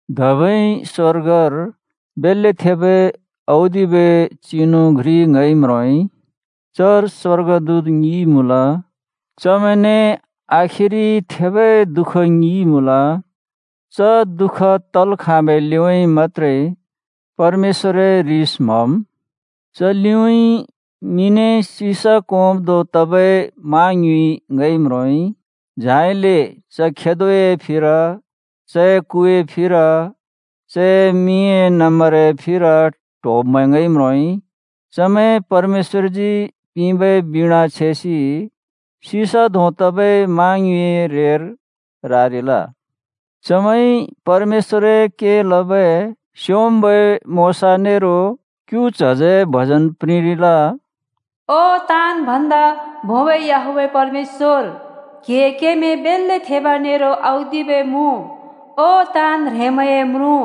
धबै स्‍वर्गर बेल्‍ले थेबै औदिबै चिनु घ्रि ङइ म्रोंइ। चर स्‍वर्गदूत ङि मुँल, चमैंने आखिरि थेबै दुःख ङि मुँल। च दुःख तल् खाँबै लिउँइँ मत्‍त्रे परमेश्‍वरए ह्रिस म्हम्। च लिउँइँ मिने सिसा कोंब् धों तबै मा ङ्युँइ ङइ म्रोंइ। झाइले च खेदोए फिर, चए कुए फिर, चए मिंए नम्‍बरए फिर ट्होब्‍मैं ङइ म्रोंइ। चमैं परमेश्‍वरजी पिंबै बीणा छेसि सिसा धों तबै मा ङ्युँइए रेर रारिल। चमैंइ परमेश्‍वरए के लबै स्‍योंम्‍बै मोशा नेरो क्‍यु च्हजए भजन प्रिंरिल: “ओ ताँन् भन्दा भोंबै याहवेह परमेश्‍वर, क्‍हिए केमैं बेल्‍ले थेब नेरो औदिबै मुँ! ओ ताँन् ह्रेंमैंए म्रुँ,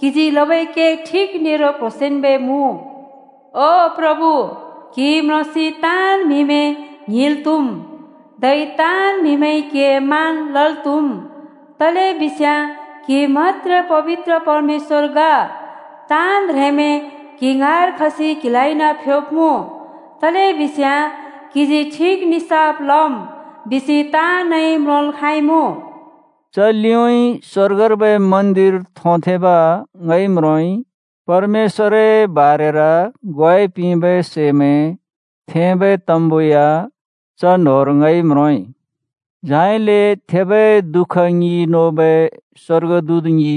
क्‍हिजी लबै के ठिक नेरो क्ह्रोंसेंन्बै मुँ। ओ प्रभु, क्‍हि म्रोंसि ताँन् म्‍हिमैं ङ्हिंल् त्‍हुम्, धै ताँन् म्हिमैंइ क्हिए मान लल् त्‍हुम्, तलेबिस्याँ क्‍हि मत्‍त्रे पबित्र परमेश्‍वर ग। ताँन् ह्रेंमैं क्‍हि ङाँर खसि क्हिलाइ फ्‍योब्‍मुँ, तलेबिस्याँ क्‍हिजी ठिक निसाफ लम् बिसि ताँनइ म्रोंल् खाँइमुँ।” च लिउँइँ स्‍वर्गर्बै मन्‍दिर थोंथेंब् ङइ म्रोंइ। परमेश्‍वरए बारेर ग्वाइ पिंबै सैमैं थेंबै तम्‍बु या च न्‍होंर ङइ म्रोंइ। झाइले थेबै दुःख ङि नोबै स्‍वर्गदूत ङि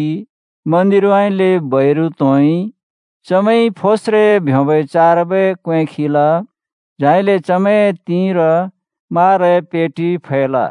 मन्‍दिरउँइँले बैरु त्‍होंइ। चमैंइ फोस्रे ब्योंबै चारबै क्‍वें खिल, झाइले चमैंए तिंर माराए पेटि फैल।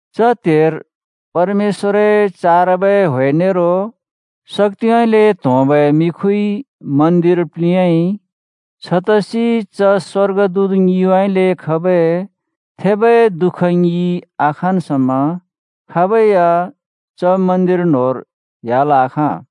च त्हेर परमेश्‍वरए चारबै ह्‍वे नेरो शक्‍तिउँइँले त्होंबै मिखुइ मन्‍दिर प्‍लिंयाइ। छतसि च स्‍वर्गदूत ङिउँइँले खबै थेबै दुःख ङि आखाँन् समा खाबै या च मन्‍दिर न्‍होंर ह्‍याल् आखाँ।